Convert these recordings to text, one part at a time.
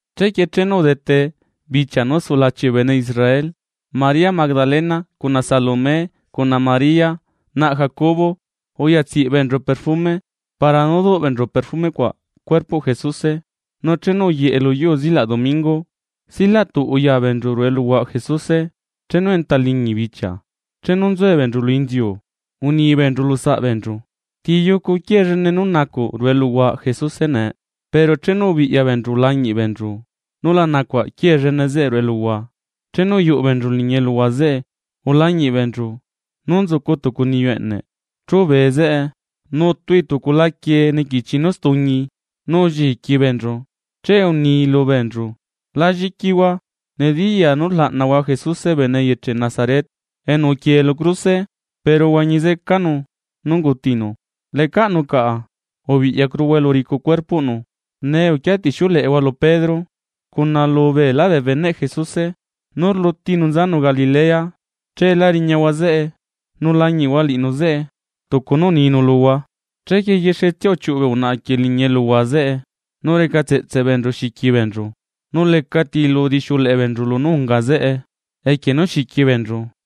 Chequie chenu udete bichia nú sulachi bee bene Israel, María Magdalena, cuna Salomé, cuna María naꞌ Jacobo, uya tsiꞌ beenchu perfume para nú duꞌ beenchu perfume cuaꞌ cuerpoꞌ Jesuse. Nu chenu uyeꞌe lu yuu zilaꞌ domingo silatuꞌ uya beenchu ruꞌu eluhuaꞌ Jesuse, chenu enta liñi bichia. Chenu nzue beenchu lu inziu uni beenchu lu saꞌbeenchu: ―¿Ti yucu quiee llene nú nacuꞌ ruꞌu eluhuaꞌ Jesuse nee? Pero chenu ubiꞌya beenchu ulañiꞌ beenchu, nu la nacuaꞌ quiee llene zeꞌe ruꞌu eluhua. Chenu uyuꞌu beenchu liñi eluhua zeꞌe, ulañiꞌ beenchu, nú nzucu tucu niyu eꞌneꞌ chubee ruꞌu eluhua zeꞌe, nutui tucu laquie niquichi nú stuñi, nu ulliqui beenchu. Che uni lubeenchu: ―La lliquihua. Nediyaa nú rlaꞌnahua Jesuse bene eyeche Nazaret enu uquiee lu cruse. Pero uhuañi zecanu nú ungutinu. Lecaꞌnu caꞌa. Ubiꞌyacuruhua elu uricu cuerpoꞌnu. Nee uquia tixiuleꞌehua lu Pedro cuna lu beelá bee beneꞌ Jesuse nú rlutinu nzanu Galilea, cheela riñahua zeꞌe; nu lañiꞌhua liꞌinu zeꞌe tucu nú uninu luhua. Chequie yexetsia uchiuꞌu bee unaꞌa quieꞌ liñi eluhua zeꞌe, nu reca tseꞌtse beenchu xiqui beenchu. Nu lecati lu udixiuleꞌe beenchu lunú unga zeꞌe, equie nú xiqui beenchu.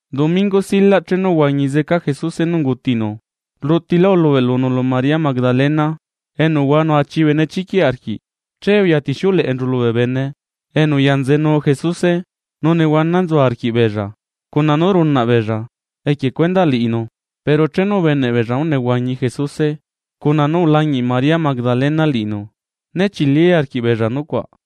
Domingo silaꞌ chenu uhuañi zeca Jesuse nú ungutinu, rlutilá ulubeꞌlunu lu María Magdalena enu uhuanu achi benechiquiꞌ arquiꞌ. Che uya tixiuleꞌenchu lubee bene enu uyanzenu Jesuse, nu nehuana nzu arquiꞌbeella cuna nú runaꞌ beella equie cuendaꞌ liꞌinu. Pero chenu ubeneꞌ beella nú nehuañi Jesuse cuna nú ulañiꞌ María Magdalena liꞌinu, né chili arquiꞌbeella nucuaꞌ.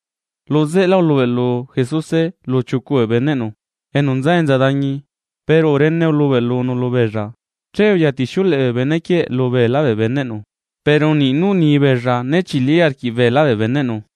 Lu zeꞌe lá ulubeꞌlu Jesuse lu chiucu bee beneꞌnu enu nza enza dañi, pero urene ulubeꞌlunu lubeella. Che uyatixiuleꞌe bee bene quieꞌ lubeelá bee beneꞌnu, pero niꞌ nú uni beella né chili arquiꞌ beelá bee beneꞌnu.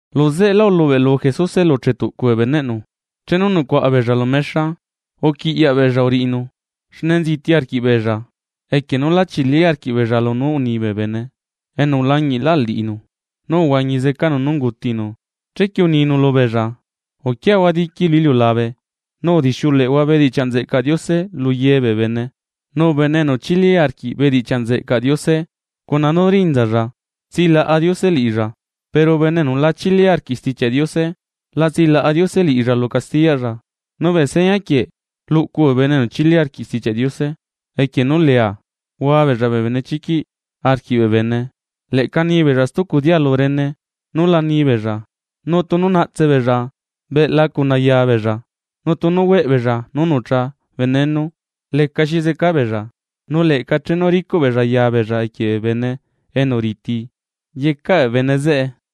Lu zeꞌelá ulubeꞌlu Jesuse lu chetuꞌcu bee beneꞌnu, chenu nucuaꞌa beella lu mexa. Uquiꞌyaꞌ beella uriꞌinu, xne nziti arquiꞌbeella equie nú la chili arquiꞌbeella lunú unibee bene enu ulañiꞌlaꞌ liꞌinu nú uhuañi zecanu nú ungutinu. Chequie uninu lubeella: ―Uquiahua diqui lu iliulabe nu udixiuleꞌehua bedichiaꞌ nzeꞌcaꞌ Diose lu ye bee bene. Nu bene enu chili arquiꞌ bedichiaꞌ nzeꞌcaꞌ Diose cuna nú rinzalla tsilaꞌa Diose liꞌilla, pero bene enu la chili arquiꞌ Stichiaꞌ Diose la tsilaꞌa Diose liꞌilla lu castiyaꞌlla. Nu bee seña quieꞌ luꞌcu bee bene enu chili arquiꞌ Stichiaꞌ Diose. Equie nú leea hua beella bee benechiquiꞌ arquiꞌ bee bene. Leꞌca nibeella stucu dialu rene nú la ni beella. Nu tunu naꞌtse beella beꞌla cuna yaa beella; nu tunu hueꞌ beella nú nucha veneno, lecaxi zeca beella; nu leꞌca chenu ricuꞌ beella ya beella equie bee bene enu riti yecaꞌ bee bene zeꞌe.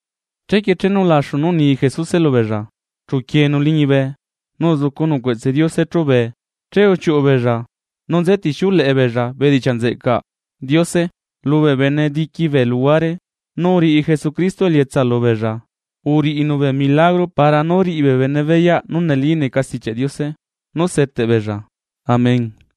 Chequie chenu ulaxu nú uni Jesuse lubeella, chu uquieenu liñibe nu uzucunu cueꞌtse Diose chubee. Che uchiuꞌu beella nú nze tixiuleꞌe beella bedichiaꞌ nzeꞌcaꞌ Diose lubee bene diqui bee luhuare. Nu uriꞌi Jesucristo elietsa lubeella, uriꞌinu bee milagro para nú riꞌi bee bene beyaꞌ nú neli neca Stichiaꞌ Diose nú seteꞌ beella. Amén.